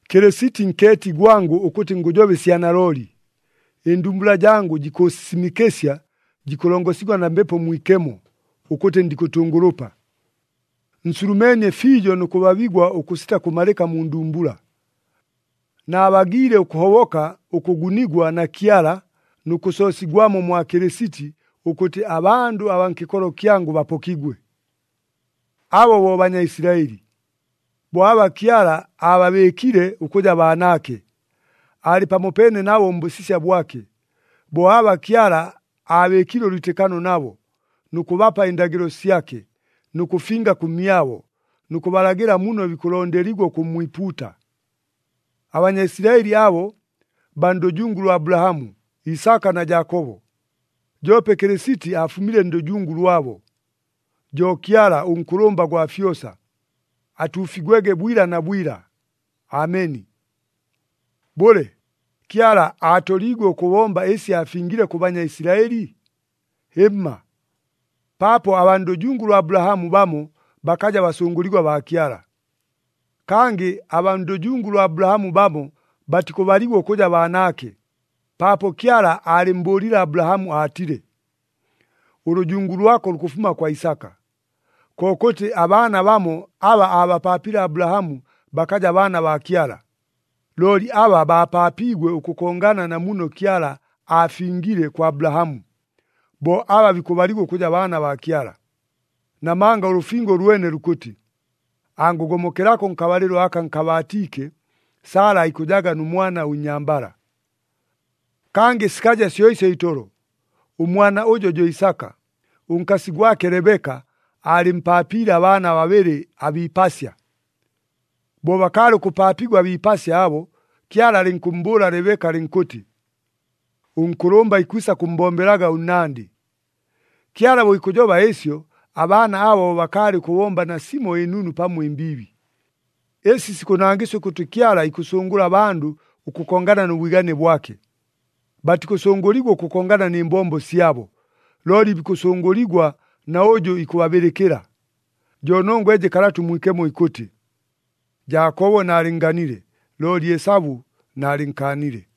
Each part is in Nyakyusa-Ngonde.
Kɨlɨsiti nkeeti gwangʉ ʉkʉtɨ ngʉjoba ɨsya nalooli, ɨndumbula jangʉ jikʉʉsisimɨkɨsya jikʉlongosigwa na Mbepo Mwikemo ʉkʉtɨ ndikʉtʉngʉlʉpa. Nsulumeenie fiijo nʉ kʉbabigwa ʉkʉsita kʉmalɨka mu ndumbula. Naabagiile ʉkʉhoboka ʉkʉgunigwa na Kyala nʉ kʉsoosigwamo mwa Kɨlɨsiti ʉkʉtɨ abandʉ abaa nkɨkolo kyangʉ bapokigwe! Abo bo Banyaisilaɨli. Bo aba Kyala aababɨɨkile ʉkʉja baanaake. Aalɨ pamopeene nabo mbʉsisya bwake. Bo aba Kyala aabɨɨkile ʉlwitɨkano nabo, nʉ kʉbapa ɨndagɨlo syake, nʉ kʉfinga kʉmyabo, nʉ kʉbalagɨla muno bikʉlondeligwa ʉkʉmmwipuuta. ABanyaisilaɨli abo, baa ndʉjungu lwa Abulahamu, Isaka na Jaakobo. Joope Kɨlɨsiti afumile ndʉjungu lwabo. Jo Kyala, ʉNkʉlʉmba gwa fyosa. Atuufigwege bwila na bwila! Ameni. Bʉle, Kyala aatoliigwe ʉkʉbomba ɨsi aafingile kʉ Banyaisilaɨli? Hɨmma! Paapo abaa ndʉjungu lwa Abulahamu bamo bakaja basʉngʉligwa baa Kyala. Kangɨ abaa ndʉjungu lwa Abulahamu bamo batikʉbaligwa ʉkʉja baanaake, paapo Kyala aalɨmmbʉʉlile Abulahamu aatile, “Ʉlʉjungu lwako lukʉfuma kwa Isaka.” Kokʉtɨ, abaana bamo aba aabapaapile Abulahamu bakaja baana baa Kyala. Looli aba bapaapiigwe ʉkʉkongana na muno Kyala aafingiile kwa Abulahamu, bo aba bikʉbaligwa ʉkʉja baana baa Kyala. Namanga ʉlʉfingo ʉlwene lukʉtɨ, “Angʉgomokelako nkabalɨlo aka nkabaatiike, Sala aikʉjaga nʉ mwana ʉnnyambala.” Kangɨ sikaja syo ɨsyo itolo. Ʉmwana ʉjo jo Isaka, ʉnkasi gwake Lebeka aalɨmpaapiile abaana babɨlɨ abiipasya. Bo bakaalɨ ʉkʉpaapigwa abiipasya abo, Kyala alɨnkʉmmbʉʉla Lebeka ʉkʉtɨ, “Ʉnkʉlʉmba ikwisa kʉmmbombelaga ʉnnandɨ.” Kyala bo ikʉjoba ɨsyo, abaana abo bo bakaalɨ ʉkʉbomba nasimo ɨnunu pamo ɨmbiibi. Ɨsi sikʉnangɨsya ʉkʉtɨ Kyala ikʉsʉngʉla abandʉ ʉkʉkongana nʉ bwigane bwake. Batikʉsʉngʉligwa ʉkʉkongana nɨ mbombo syabo, looli bikʉsʉngʉligwa na ʉjʉ ikʉbabɨlɨkɨla. Jo nongwa ɨjɨ Kalata ʉMwikemo ikʉtɨ, “Jaakobo naalɨnnganile, looli Esabu naalɨnkaanile.”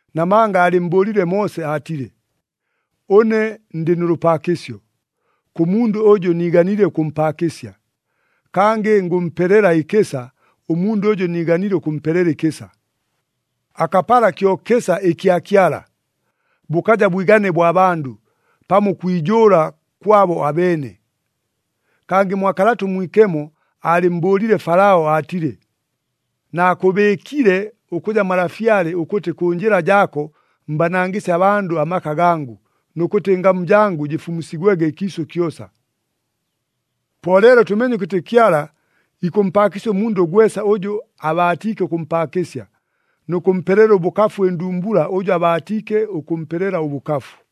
Namanga aalɨmmbʉʉlile Moose aatile, “Ʉne ndɨ nʉ lʉpaakɨsyo kʉ mundʉ ʉjʉ niiganile ʉkʉmpaakɨsya, kangɨ ngʉmpelela ɨkɨsa ʉmundʉ ʉjʉ niiganile ʉkʉmpelela ɨkɨsa.” Akapala kyo kɨsa ɨkya Kyala, bʉkaja bwigane bwa bandʉ, pamo ʉkwijʉʉla kwabo abeene. Kangɨ mwa Kalata ʉMwikemo aalɨmmbʉʉlile Falao aatile, “Naakʉbɨɨkile ʉkʉja malafyale ʉkʉtɨ kʉ njɨla jaako mbanangɨsye abandʉ amaka gangʉ, nʉ kʉtɨ ɨngamu jangʉ jɨfumusigwege ɨkiisʉ kyosa.” Po leelo tʉmeenye ʉkʉtɨ Kyala ikʉmpaakɨsya ʉmundʉ gwesa ʉjʉ abaatiike ʉkʉmpaakɨsya, nʉ kʉmpelela ʉbʉkafu ɨndumbula ʉjʉ abaatiike ʉkʉmpelela ʉbʉkafu.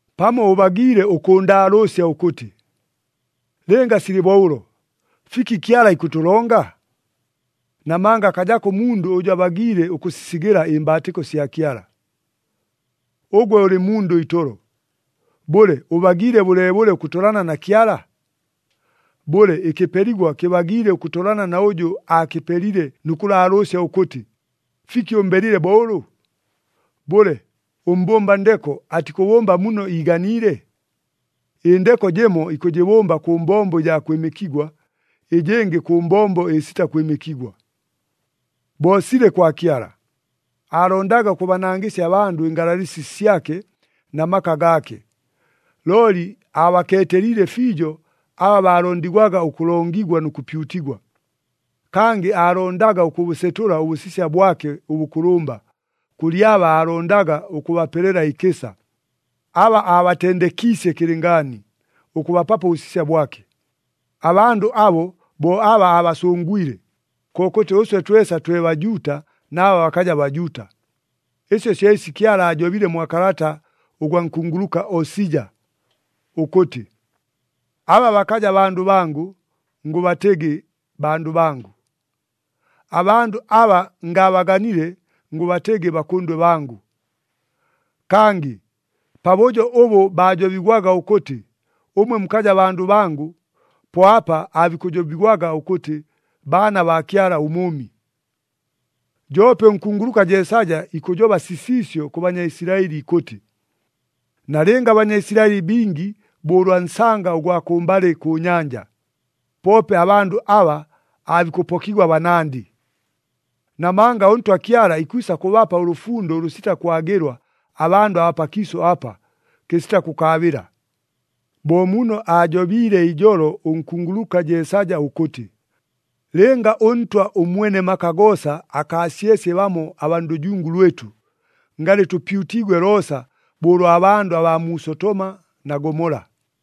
Pamo ʉbagiile ʉkʉʉndaalʉʉsya ʉkʉtɨ, “Lɨnga silɨ bo ʉlo, fiki Kyala ikʉtʉlonga? Namanga akajako ʉmundʉ ʉjʉ abagiile ʉkʉsisigɨla ɨmbaatɨko sya Kyala.” Ʉgwe ʉlɨ mundʉ itolo! Bʉle, ʉbagiile bʉleebʉle ʉkʉtolana na Kyala? Bʉle, ɨkɨpeligwa kɨbagiile ʉkʉtolana na ʉjʉ aakɨpelile nʉ kʉlaalʉʉsya ʉkʉtɨ, “Fiki ʉmbelile bo ʉlʉ?” Bʉle, ʉmbʉmba ndeko atikʉbʉmba muno iiganiile? Ɨndeko jɨmo ikʉjɨbʉmba kʉ mbombo ɨjaa kwɨmɨkigwa, ɨjɨngɨ kʉ mbombo ɨsita kwɨmɨkigwa. Bo silɨ kwa Kyala. Aalondaga ʉkʉbanangɨsya abandʉ ɨngalalɨsi syake na maka gaake, looli abakeeteliile fiijo aba baalondigwaga ʉkʉlongigwa nʉ kʉpyutigwa. Kangɨ aalondaga ʉkʉbʉsetʉla ʉbʉsisya bwake ʉbʉkʉlʉmba, kʉlɨ aba aalondaga ʉkʉbapelela ɨkɨsa, aba aabatendekiisye kɨlɨngaani ʉkʉbapapo ʉbʉsisya bwake. Abandʉ abo, bo aba aabasʉngwile, kokʉtɨ ʉswe twesa twe Bajuuta na aba bakaja Bajuuta. Ɨsi syo ɨsi Kyala aajobile mwa kalata ʉgwa nkunguluka Osija ʉkʉtɨ, “Aba bakaja bandʉ bangʉ, ngʉbatɨgɨ, ‘Bandʉ bangʉ.’ Abandʉ aba ngaabaganile, ngʉbatɨgɨ, ‘Bakʉndwe bangʉ.’” Kangɨ, “Pabʉjo ʉbʉ baajobigwaga ʉkʉtɨ, ‘Ʉmwe mukaja bandʉ bangʉ,’ po apa aabikʉjobigwaga ʉkʉtɨ, ‘Baana baa Kyala ʉMʉʉmi.’” Joope ʉnkunguluka Jeesaja ikʉjoba sisiisyo kʉ Banyaisilaɨli ikʉtɨ, “Nalɨnga aBanyaisilaɨli bingi bo ʉlwa nsanga ʉgwa kʉmbalɨ kʉ nyanja, poope abandʉ aba aabikʉpokigwa banandɨ. Namanga ʉNtwa Kyala ikwisa kʉbapa ʉlʉfundo ʉlʉsita kwagɨlwa abandʉ abaa pakiisʉ apa, kɨsita kʉkaabɨla.” Bo muno aajobiile ijolo ʉnkunguluka Jeesaja ʉkʉtɨ, “Lɨnga ʉNtwa ʉMwene maka goosa akaasyesye bamo abaa ndʉjungu lwɨtʉ, ngalɨ tʉpyutiigwe loosa bo ʉlwa bandʉ abaa mu Sotoma na Gomola.”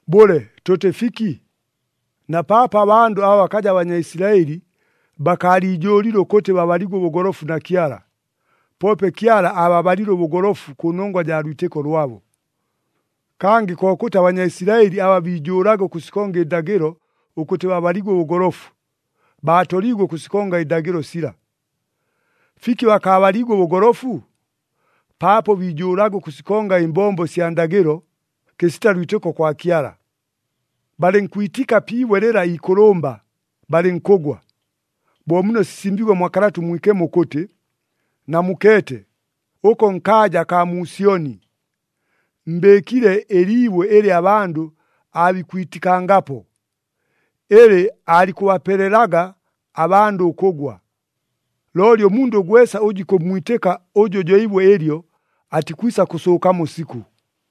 Bʉle, tʉtɨ fiki? Na paapo abandʉ aba bakaja Banyaisilaɨli bakaaliijʉʉlile ʉkʉtɨ babaligwe ʉbʉgolofu na Kyala, poope Kyala aababalile ʉbʉgolofu kʉ nongwa jaa lwitɨko lwabo. Kangɨ kokʉtɨ, aBanyaisilaɨli aba biijʉʉlaga ʉkʉsikonga ɨndagɨlo ʉkʉtɨ babaligwe ʉbʉgolofu, baatoliigwe ʉkʉsikonga ɨndagɨlo sila. Fiki bakaabaliigwe ʉbʉgolofu? Paapo biijʉʉlaga ʉkʉsikonga ɨmbombo sya ndagɨlo, kɨsita lwitɨko kwa Kyala. Balɨnkwitika pi ibwe lɨla iikʉlʉmba, balɨnkʉgwa. Bo muno sisimbiigwe mwa Kalata ʉMwikemo ʉkʉtɨ, “Namukeete, ʉko nkaaja akaa mu Syoni, mbɨɨkile ɨliibwe ɨlɨ abandʉ aabikwitikangapo, ɨlɨ aalikʉbapelelaga abandʉ ʉkʉgwa. Looli ʉmundʉ gwesa ʉjʉ ikʉmmwitɨka ʉjʉ jo ibwe ɨlyo, atikwisa kʉsʉʉkamo sikʉ!”